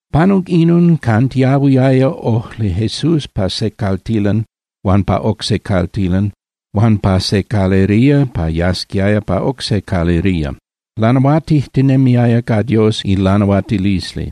Panuc inon, cantiahuiaya ojli Jesús pa se caltilan huan pa oc se caltilan huan pa se calería pa yasquiaya pa oc se calería. Lanahuatijtinemiaya ca Dios ilanahuatilisli,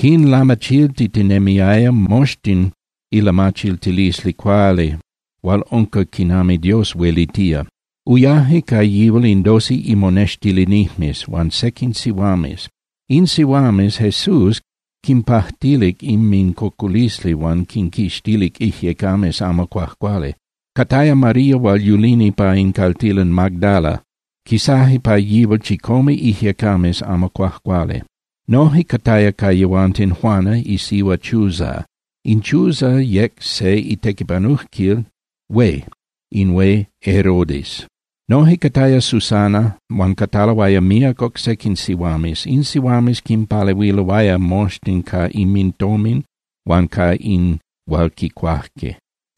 quinlamachiltitinemiaya moxtin ilamachiltilisli cuali hual unca quinami Dios huelitía. Uyaje ca yihual in doce imonextilinijmes huan sequin sihuames. In sihuames Jesús quinpajtilic inmincocolisli huan quinquixtilic ijyecames amo cuajcuali. Cataya María hual yulini pa in caltilan Magdala, quisaje pa yihual chicome ijyecames amo cuajcuali. Noje cataya ca yehuanten Juana isihua Chuza. In Chuza yec se itequipanujquil hué in hué Herodes. Noje cataya Susana huan cataloaya míac oc sequin sihuames. In sihuames quinpalehuiloaya moxtin ca inmintomin huan ca in hual quicuaje.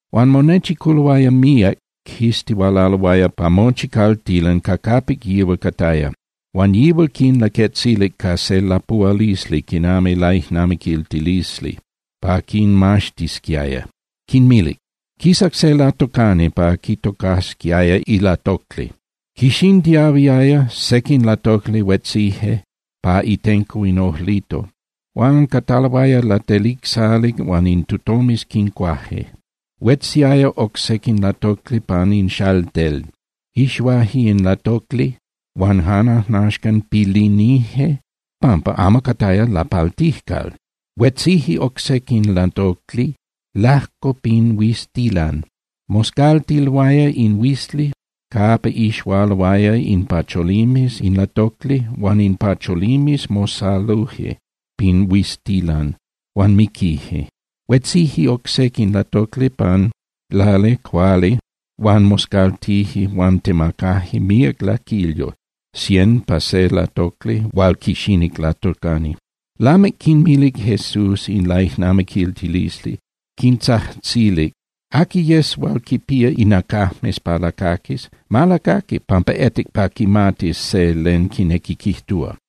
Huan monechiculoaya míac, quistihualaloaya pa mochi caltilan ca capic yihual cataya. Huan yihual quinlaquetzilic ca se lapuhualisli quinami laijnamiquiltilisli pa quinmaxtisquiaya, quinmilic: —Quisac se latocani pa quitocasquiaya ilatocli. Quixintiahuiaya, sequin latocli huetzije pa itenco in ojlito huan cataloaya latelicsali huan in tutomes quincuaje. Huetziaya oc sequin latocli pan in xaltel, ixuaje in latocli huan jan ajnaxcan pilinije pampa amo cataya lapaltijcal. Huetzije oc sequin latocli lajco pin huiztilan, moscaltiloaya in huizli capa ixualoaya in ipacholimes in latocli huan in pacholimes mosaluje pin huiztilan huan miquije. Huetzije oc sequin latocli pan lali cuali huan moscaltije huan temacaje míac laquilyo, cien pa se latocli hual quixinic in latocani. Lamic quinmilic Jesús in laijnamiquiltilisli, quintzajtzilic: —Aqui yes hual quinpía inacajmes pa lacaquis, ma lacaqui pampa etic pa quimatis se len quinequi quijtúa.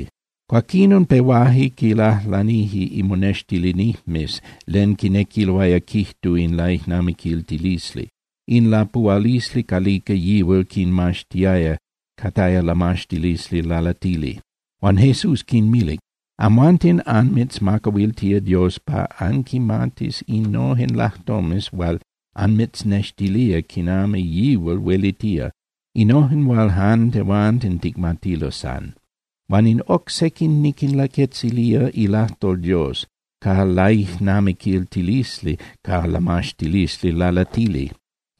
Cuaquinon pehuaje quilajlanije imonextilinijmes len quinequiaya quijtu in laijnamiquiltilisli, in lapuhualisli calica yihual quinmaxtiaya, cataya lamaxtilisli lalatili. Huan Jesús quinmilic: —Amhuanten anmitzmacahuiltía Dios pa anquimatis innojen lajtomes hual anmitznextilía quinami yihual huelitía, innojen hual jan tehuanten ticmatilo san. Huan in oc sequin niquinlaquetzilía ilajtol Dios ca laijnamiquiltilisli ca lamaxtilisli lalatili.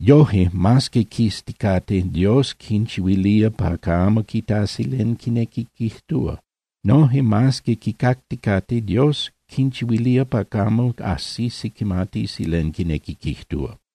Yoje, mas que quizticate, Dios quinchihuilía pa camo quitasi len quinequi quijtúa. Noje, mas que quicacticate, Dios quinchihuilía pa camo ajsisi quimatisi len quinequi quijtúa.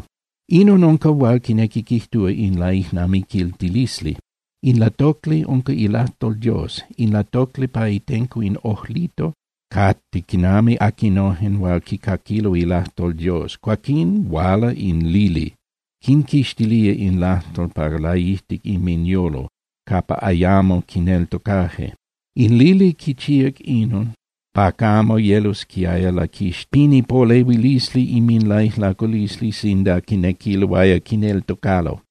’Inon unca hual quinequi quijtúa in laijnamiquiltilisli: In latocli unca ilajtol Dios. In latocli pa itenco in ojlito cate quinami aquinojen hual quicaquilo ilajtol Dios, cuaquín huala in lili, quinquixtilía in lajtol pa laijtic inminyolo capa ayamo quineltocaje. In lili quichíac inon pa camo yelosquiaya laquixtili pin ipolehuilisli inminlaijlaculisli sinda quinequiloaya quineltocalo.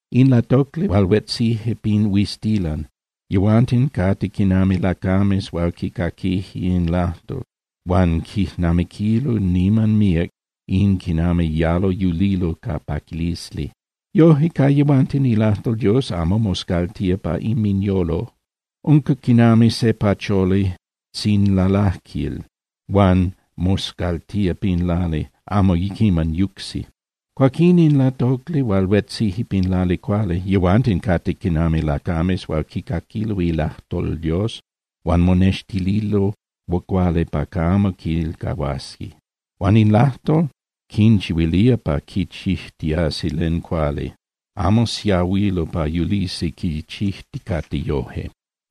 In latocli hual huetzije pin huiztilan, yehuanten cate quinami lacames hual quicaquije in lajtol huan quijnamiquilo niman míac in quinami yalo yulilo ca paquilisli. Yoje ca yehuanten ilajtol Dios amo moscaltía pa inminyolo, unca quinami se pacholi tzinlalajquil hual moscaltía pin lali, amo quiman yucsi. Huan in latocli hual huetzije pin lali cuali, yehuanten cate quinami lacames hual quicaquilo ilajtol Dios huan monextililo cuali pa camo quilcahuasi. Huan in lajtol quinchihuilía pa quichijtiasi len cuali, amo siahuilo pa yulisi quichijticate yoje.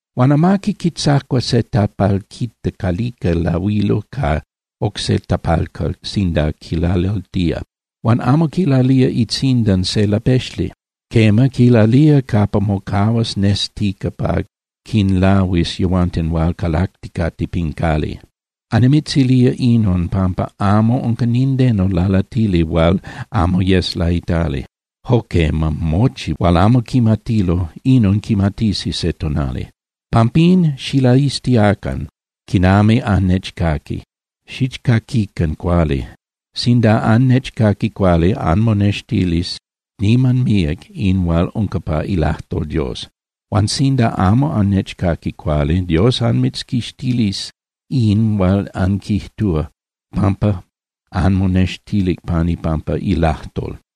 ’Huan amaqui quitzacua se tapalquita calica lahuilo ca oc se tapalcal sinda quilalaltía. Huan amo quilalía itzindan se lapexli. Quema, quilalía capa mocahuas nestica pa quinlahuis yehuanten hual calacticate pin cali. Annimitzilía inon pampa amo unca nindeno lalatili hual amo yes laitali. Jo quema, mochi hual amo quimatilo, inon quimatisi se tonali. Pampín xilaiztiacan quinami annechcaqui, xichcaquican cuali. Sinda annechcaqui cuali, anmonextilis niman míac in hual unca pa ilajtol Dios. Huan sinda amo annechcaqui cuali, Dios anmitzquixtilis in hual anquijtúa pampa anmonextilic pan ipampa ilajtol.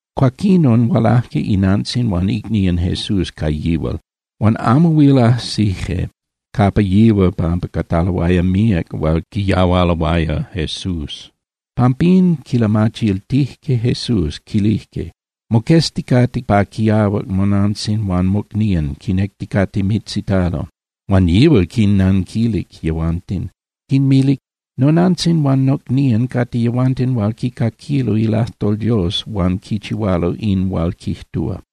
Cuaquinon hualaje inantzin huan icnían Jesús ca yihual, huan amo huil ajsije capa yihual pampa cataloaya míac hual quiyahualuloaya Jesús. Pampín quilamachiltijque Jesús, quilijque: —Moquezticate pa quiahuac monantzin huan mocnían quinecticate mitzitalo. Huan yihual quinnanquilic yehuanten, quinmilic: —Nonantzin huan nocnían cate yehuanten hual quicaquilo ilajtol Dios huan quichihualo in hual quijtúa.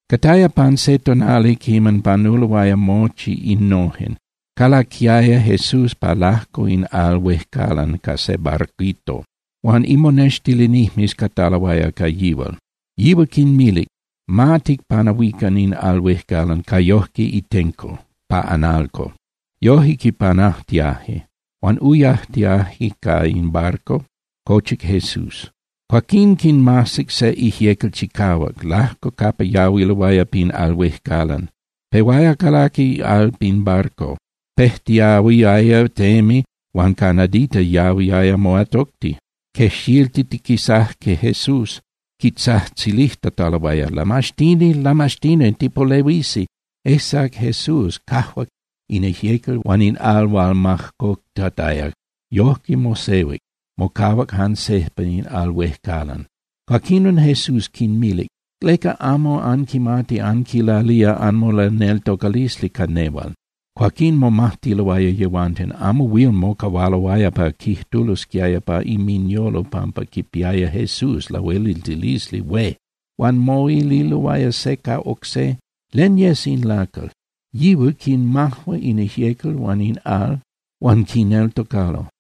Cataya pan se tonali quiman panuloaya mochi innojen, calaquiaya Jesús pa lajco in al huejcalan ca se barquito. Huan imonextilinijmes cataloaya ca yihual. Yihual quinmilic: —Ma ticpanahuican in al huejcalan ca yoje itenco (pa analco). Yoje quipanajtiaje. Huan uyajtiaje ca in barquito, cochic Jesús. Cuaquín quinmajsic se ijyecal chicahuac lajco capa yahuiloaya pin al huejcalan. Pehuaya calaqui al pin barquito, pejtiahuiaya temi huan ca nadita yahuiaya moatocti. Quejxiltitiquisajque Jesús, quitzajtzilijtataloaya: —¡Lamaxtini, Lamaxtini! ¡Tipolehuisi! Ejsac Jesús, cajuac in ijyecal huan in al hual majcoctataya, yojque mosehuic, mocahuac jan sejpa in al huejcalan. Cuaquinon Jesús quinmilic: —¿Leca anmomajtic? ¿Leca amo anquimati anquilalía anmolaneltocalisli ca nehual? Cuaquín momajtiloaya yehuanten, amo huil mocahualoaya pa quijtulosquiaya pa inminyolo pampa quipiaya Jesús lahueliltilisli hué. Huan moililoaya se ca oc se: —¿Len yes in lacal? Yihual quinmajua in ijyecal huan in al, huan quineltocalo.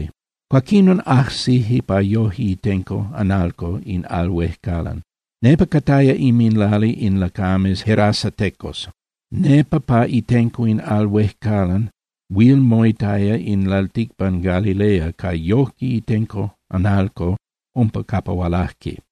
Cuaquinon ajsijque pa yoje itenco (analco) in al huejcalan. Nepa cataya inminlali in lacames gerasatecos. Nepa pa itenco in al huejcalan huil moitaya in lalticpan Galilea ca yoje itenco (analco) umpa capa hualajque.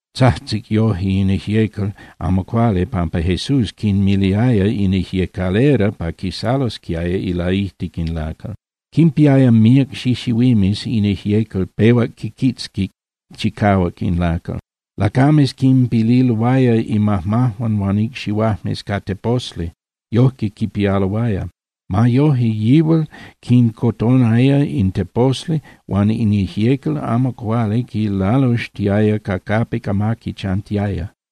Tzajtzic yoje in ijyecal amo cuali, pampa Jesús quinmiliaya in ijyecalera pa quisalosquiaya ilaijtic in lacal. Quimpiaya míac xixihuimes in ijyecal pehuac quiquitzquic chicahuac in lacal. Lacames quilpililoaya imajmajuan huan icxihuajmes ca teposli, yojque quipialoaya. Ma yoje, yihual quincotonaya in teposli huan in ijyecal amo cuali quilaluxtiaya ca capic amaqui chantiaya.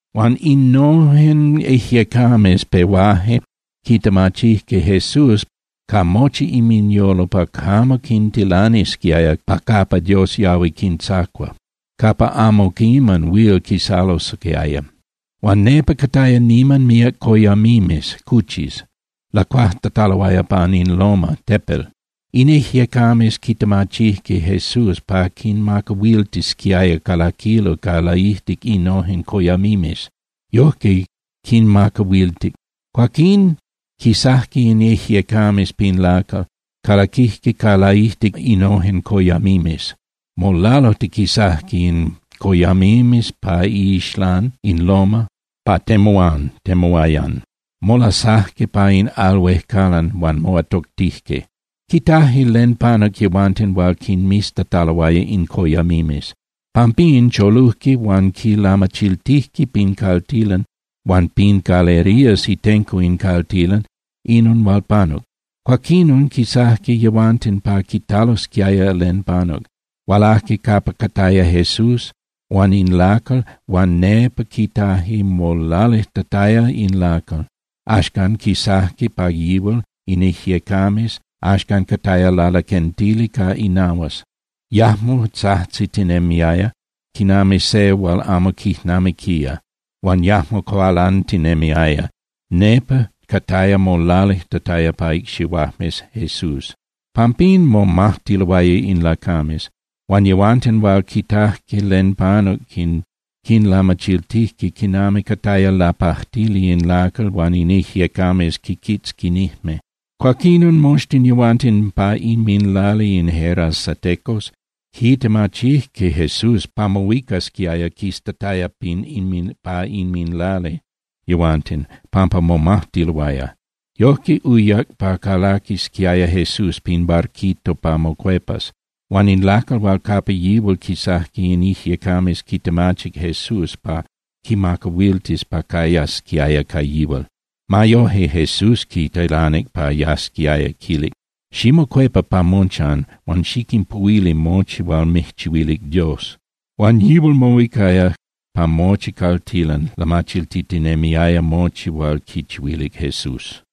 Huan innojen ijyecames pehuaje quitemachijque Jesús ca mochi inminyolo pa camo quintilanisquiaya pa capa Dios yahui quintzacua, capa amo quiman huil quisalosquiaya. Huan nepa cataya niman míac coyamimes (cuchis), lacuajtataloaya pan in loma (tepel). In ijyecames quitemachijque Jesús pa quinmacahuiltisquiaya calaquilo ca laijtic innojen coyamimes. Yojque quinmacahuiltic. Cuaquín quisajque in ijyecames pin lacal, calaquijque ca laijtic innojen coyamimes. Molalujtiquisajque in coyamimes pa iixlán in loma pa temuán (temuayan), molasajque pa in al huejcalan huan moatoctijque. Quitajque len panuc yehuanten hual quinmiztataloaya in coyamimes. Pampín cholujque huan quilamachiltijque pin caltilan huan pin calerías itenco in caltilan inon hual panuc. Cuaquinon quisajque yehuanten pa quitalosquiaya len panuc, hualajque capa cataya Jesús huan in lacal huan nepa quitaje molalijtataya in lacal. Axcan quisajque pa yihual in ijyecames, axcan cataya lalaquentili ca inahuas. Yajmo tzajtzitinemiaya quinami se hual amo quijnamiquía, huan yajmo cualantinemiaya, nepa cataya molalijtataya pa icxihuajmes Jesús. Pampín momajtiloaya in lacames. Huan yehuanten hual quitajque len panuc quinlamachiltijque quinami cataya lapajtili in lacal hual in ijyecames quiquitzquinijme. Cuaquinon moxtin yehuanten pa inminlali in gerasatecos quitemachijque Jesús pa mohuicasquiaya quistataya pa inminlali yehuanten, pampa momajtiloaya. Yojque uyac pa calaquisquiaya Jesús pin barquito pa mocuepas. Huan in lacal hual capa yihual quisajque in ijyecames quitemachic Jesús pa quimacahuiltis pa cayasquiaya ca yihual. Ma yoje, Jesús quitilanic pa yasquiaya, quilic: —Ximocuepa pa mochan huan xiquinpuhuili mochi hual mijchihuilic Dios. Huan yihual mohuicaya pa mochi caltilan lamachiltitinemiaya mochi hual quichihuilic Jesús.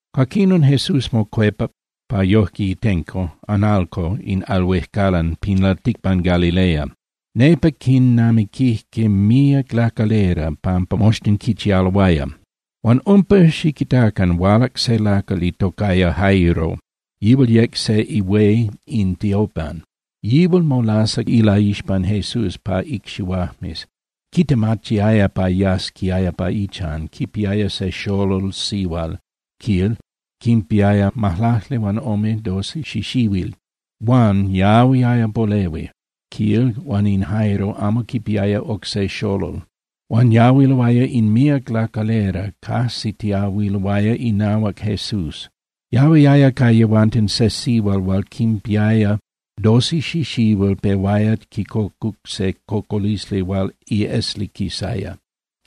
Cuaquinon Jesús mocuepac pa yoje itenco (analco) in al huejcalan pin lalticpan Galilea. Nepa quinamiquijque míac lacalera, pampa moxtin quichialoaya. Huan umpa, xiquitacan, hualac se lacal itocaya Jairo, yihual yec se ihué in tiopan. Yihual molasac ilaixpan Jesús pa icxihuajmes, quitemachiaya pa yasquiaya pa ichan. Quipiaya se xolol sihual, quil, quinpiaya majlaclihuanome (doce) xixihuil, huan yahuiaya polehui, quil, huan in Jairo amo quipiaya oc se xolol. Huan yahuiloaya in míac lacalera cajsitiahuiloaya inahuac Jesús. Yahuiaya ca yehuanten se sihual hual quinpiaya doce xixihuil pehuaya quicocu se cocolisli hual iesli quisaya.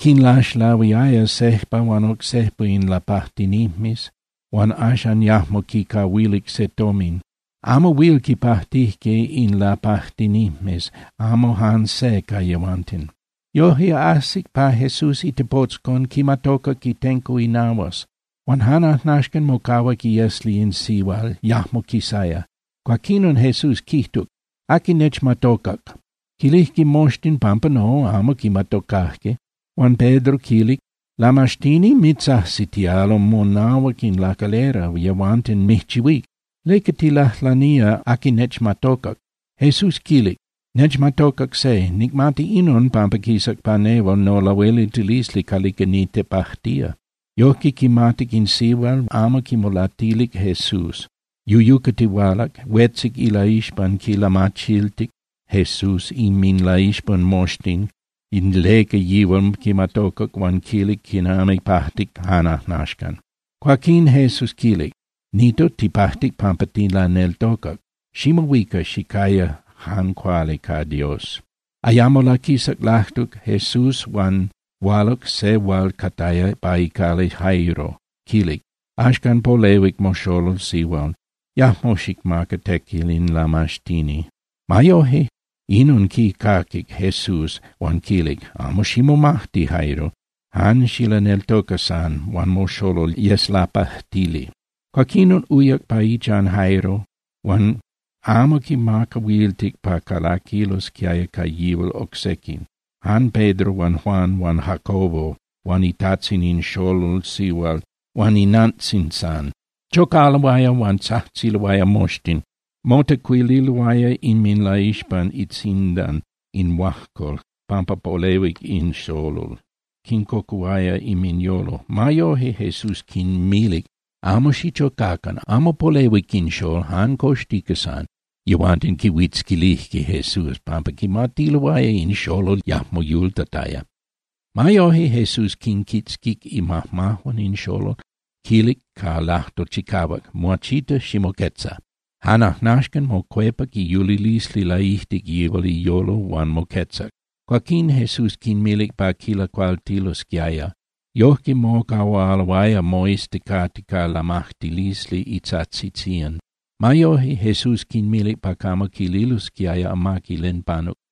Quinlaxlahuiaya sejpa huan oc sejpa in lapajtinijmes huan axan yajmo quicahuilic se tomin. Amo huil quipajtijque in lapajtinijmes, amo jan se ca yehuanten. Yoje ajsic pa Jesús itepotzcon, quimatocac itenco inahuas. Huan jan ajnaxcan mocahuac iesli in sihual, yajmo quisaya. Cuaquinon Jesús quijtuc: —¿Aqui nechmatocac? Quilijque moxtin pampa no, amo quimatocajque. Huan Pedro quilic: —Lamaxtini, mitzajsitialo monahuac in lacalera, yehuanten mijchihuíc. ¿Leca tilajlanía: “Aqui nechmatocac”? Jesús quilic: —Nechmatocac se. Nicmati inon, pampa quisac pa nehual nolahueliltilisli calica nitepajtía. Yojque quimatic in sihual amo huil quimolatilic Jesús. Yuyucatihualac, huetzic ilaixpan, quilamachiltic Jesús inminlaixpan moxtin leca yihual quimatocac huan quilic quinami pajtic jan ajnaxcan. Cuaquín Jesús quilic: —Nito, tipajtic pampa tilaneltocac. Ximohuica, xicaya jan cuali ca Dios. Ayamo laquisac lajtuc Jesús huan hualac se hual cataya pa icali Jairo, quilic: —Axcan polehuic moxolol sihual. Yajmo xicmaca tequil in lamaxtini. Ma yoje, inon quicaquic Jesús, huan quilic: —Amo ximomajti, Jairo, jan xilaneltoca san, huan moxolol yes lapajtili. Cuaquinon uyac pa ichan Jairo, huan amo quimacahuiltic pa calaquilosquiaya ca yihual oc sequin, jan Pedro huan Juan huan Jacobo huan itajtzin in xolol sihual huan inantzin san. Chocaloaya huan tzajtziloaya moxtin, motecuililoaya inminlaixpan itzindan in huajcol pampa polehuic in xolol, quincocuhuaya inminyolo. Ma yoje, Jesús quinmilic: —Amo xichocacan. Amo polehuic in xól, jan coxtica san. Yehuanten quihuitzquilijque Jesús pampa quimatiloaya in xolol yajmo yultataya. Ma yoje, Jesús quinquitzquic imajmajuan in xolol, quilic ca lajtol chicahuac: —Muachita, ximoquetza. Jan ajnaxcan mocuepac iyulilisli laijtic yihual iyolo huan moquetzac. Cuaquín Jesús quinmilic pa quilacualtilosquiaya. Yoje mocahualoaya moizticate ca lamajtilisli itajtzitzían. Ma yoje, Jesús quinmilic pa camo quililosquiaya amaqui len panuc.